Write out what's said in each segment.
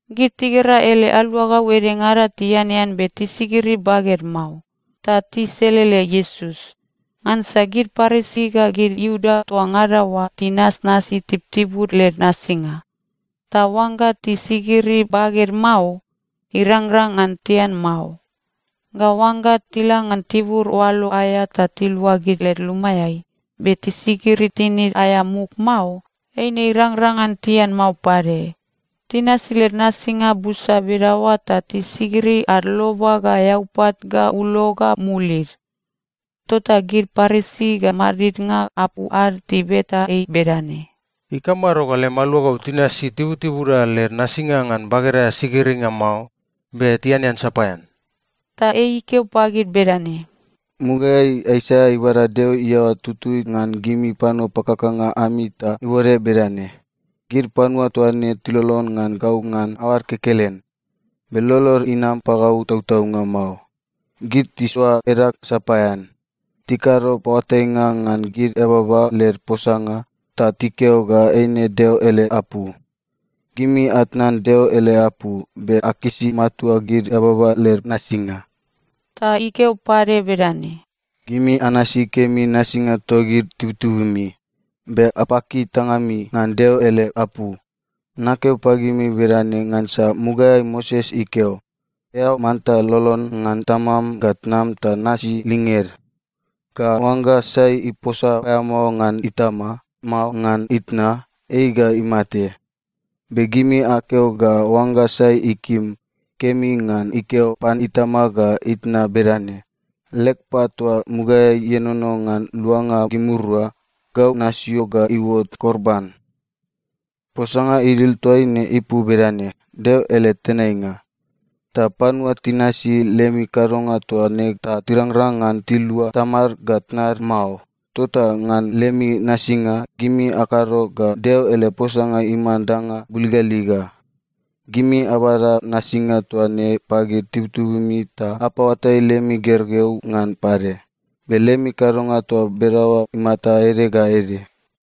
Gid tigera ele aluagau edengada tianean be tisigiri baged mao, ta tiselele Iesus. (Ngansa gid Parisi ga gid Iuda toa ngada oa tinasnasi tibutibud led nasinga, ta oangga tisigiri baged mao, irangrang ngan tian mao. Ga oangga tila ngan tibur oalo aea ta tiluagid led lumaeai, be tisigiri tinid aea muk mao, eine irangrang ngan tian mao pade. Tinasi led nasinga busa bedaoa ta tisigiri ad loba ga eaupat ga ulo ga mulid.) Tota gid Parisi ga madidnga apu ad tibeta ei bedane, “Ikamado ga lem aluagau tinasi tibutibuda led nasinga ngan bageda aea sigiringa mao, be tianean sapaean?” Ta ei ikeo pagid bedane, “Mugaeai Aisaia ibada Deo iaoa tutui ngan gimi panua pakakanga ami ta ibode bedane, “‘Gid panua toa ne tilolon ngan gau ngan aoad kekelen, be lolod inam pagau tautaunga mao. Gid tisoa edag sapaean. Tikado paoatainga ngan gid eababa led posanga ta tikeo ga eine Deo ele apu.’ Gimi atnan Deo ele apu, be akisi matua gid eababa led nasinga.” Ta ikeo pade bedane, “Gimi anasi kemi nasinga togid tibutibumi, be apaki tangami ngan Deo ele apu. Nakeo pagimi bedane ngansa mugaeai Moses ikeo, ‘Eao manta lolon ngan tamam ga tnam ta nasi linged,’ ga ‘Oangga sai iposa paeamao ngan itama, mao ngan itna, ei ga imate.’ Be gimi akeo ga oangga sai ikim, kemi ngan ikeo pan itama ga itna bedane, ‘Leg pat toa mugaeai ienono ngan luanga gimirua, gau nasio ga iuot korban.’ (Posanga idil toaine ipu bedane: Deo ele tenainga.) Ta panua tinasi lemi kadonga toa ne ta tirangrang ngan tilua tamad ga tnad mao. Tota ngan lemi nasinga, gimi akado ga Deo ele posanga iman danga buligaliga. Gimi abada nasinga toa ne pagid tibutibumi ta apaoatai lemi gergeu ngan pade. Be lemi kadonga toa bedaoa imata ede ga ede.”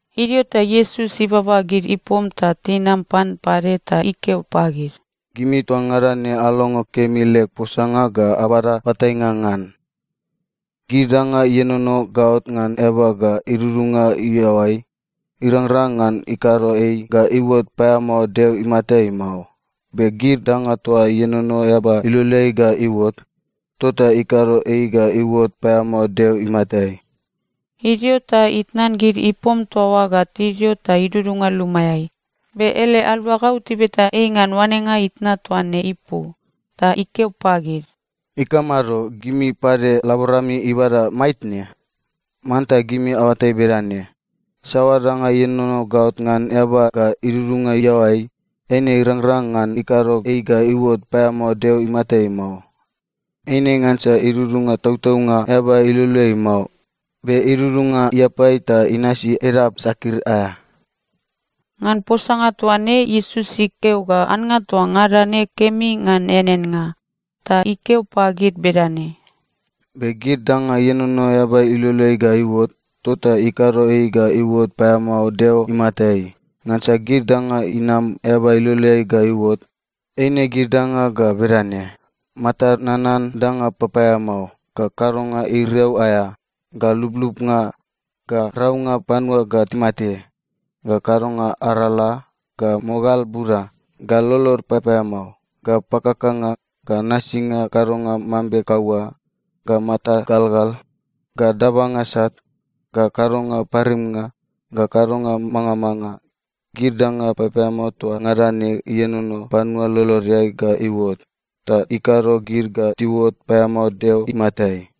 Idio ta Iesus ibaba gid ipom ta tinam pan pade ta ikeo pagid, “Gimi toa ngada ne alongo kemi leg posanga ga abada oatainga ngan. Gid danga ienono gaot ngan eaba ga idudunga iaoai, irangrang ngan ikado ei ga iuot paeamao Deo imatai mao. Be gid danga toa ienono eaba iloleai ga iuot, tota ikado ei ga iuot paeamao Deo imatai.” Idio ta itnan gid ipom toa oa ga tidio ta idudunga lumaeai. Be ele aluagau tibeta ei ngan oanenga itna toa ne ipu. Ta ikeo pagid, “Ikamado? Gimi pade laborami ibada maitne? Manta gimi aoatai bedane: Saoa danga ienono gaot ngan eaba ga idudunga iaoai, eine irangrang ngan ikado ei ga iuot paeamao Deo imatai mao. Eine ngansa idudunga tautaunga eaba iloleai mao, be idudunga iapai ta inasi edap sakir aea.” (Ngan posanga toa ne, Iesus ikeo ga annga toa ngada ne kemi ngan eaneannga.) Ta ikeo pade bedane, “Be gid danga ienono eaba iloleai ga iuot, tota ikado ei ga iuot paeamao Deo imatai. Ngansa gid danga inam eaba iloleai ga iuot, eine gid danga ga bedane: matad nanan danga papaeamao, ga kadonga iriau aea, ga lublubnga, ga raunga panua ga timate, ga kadonga arala, ga mogal buda, ga lolod papaeamao, ga pakakanga, ga nasinga kadonga mambe kaua, ga mata galgal, ga dabanga sat, ga kadonga parimnga, ga kadonga mangamanga. Gid danga papaeamao toa ngada ne ienono panua lolodeai ga iuot, ta ikado gid ga tiuot paeamao Deo imatai.”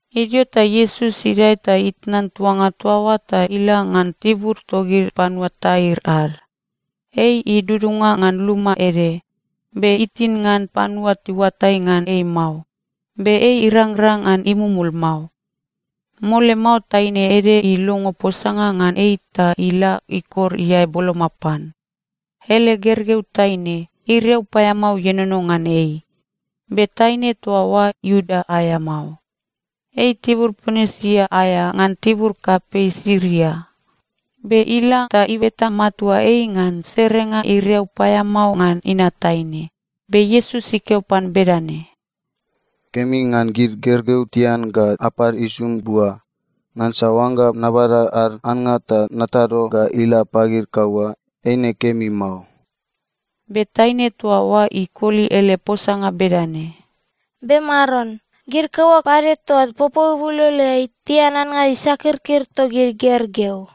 Idio ta Iesus idae ta itnan tuanga toa oa ta ila ngan tibur togid panua Tair ad. Ei idudunga ngan luma ede, be itin ngan panua tiuatai ngan ei mao. Be ei irangrang ngan imumul mao. Mole mao taine ede ilongo posanga ngan ei ta ila ikor iae boloma pan. Ele gergeu taine, iriau paeamao ienono ngan ei. Be taine toa oa Iuda aea mao. Ei tibur Ponisia aea ngan tibur kapei Siria. Be ila ta ibeta matua ei ngan serenga iriau paeamao ngan inat taine. Be Iesus ikeo pan bedane, “Kemi ngan gid gergeu tian ga apad isum bua. Ngansa oangga nabada ad annga ta natado ga ila pagid kaua, eine kemi mao.” Be taine toa oa ikoli ele posanga bedane, “Be Maron, gid kaua pade toa popou ibuloloeai tian annga isakirkir togid gergeu.”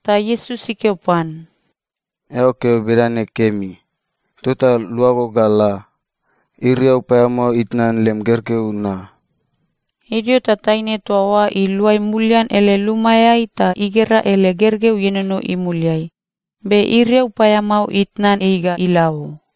Ta Iesus ikeo pan, “Eao keo bedane kemi. Tota luago ga la. Iriau paeamao itnan lem gergeu na.” Idio ta taine toa oa iluai mulian ele lumaeai ta igera ele gergeu ienono imuliai, be iriau paeamao itnan ei ga ila o.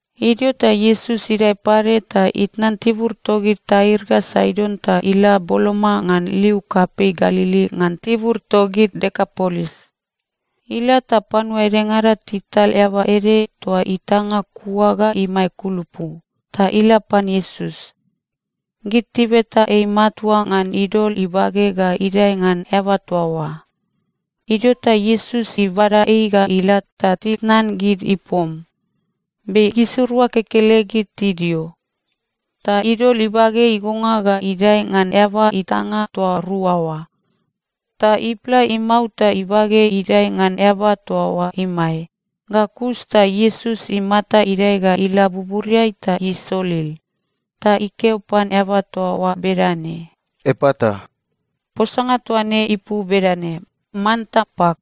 Idio ta Iesus idae pade ta itnan tibur togid Tair ga Saidon ta ila boloma ngan liu kapei Galili ngan tibur togid Dekapolis. Ila ta panua edengada tital eaba ede toa itanga kua ga imae kulupu, ta ila pan Iesus. Gid tibeta ei matua ngan idol ibage ga idae ngan eaba toa oa. Idio ta Iesus ibada ei ga ila ta titnan gid ipom, be gisirua kekelegid tidio. Ta idol ibage igonga ga idae ngan eaba itanga toa rua oa. Ta ipla imau ta ibage idae ngan eaba toa oa imae. Ga kus ta Iesus imata idae ga ila buburiai ta isolil. Ta ikeo pan eaba toa oa bedane, “Epata!” (Posanga toa ne ipu bedane, “Manta pak!”)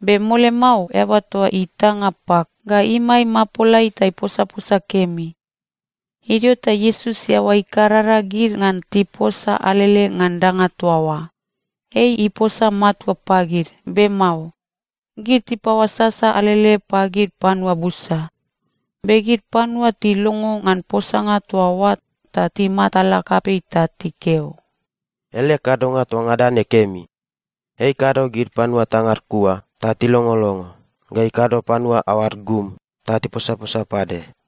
Be mole mao, eaba toa itanga pak ga imae imapolai ta iposaposa kemi. Idio ta Iesus iaoa ikarara gid ngan tiposa alele ngan danga toa oa. Ei iposa matua pagid, be mao. Gid tipaoasasa alele pagid panua busa. Be gid panua tilongo ngan posanga toa oa ta timatala kapei ta tikeo, “Ele kadonga toa ngada ne kemi. Ei ikado gid panua tangad kua ta tilongolongo, ga ikado panua aoad gum ta tiposaposa pade.”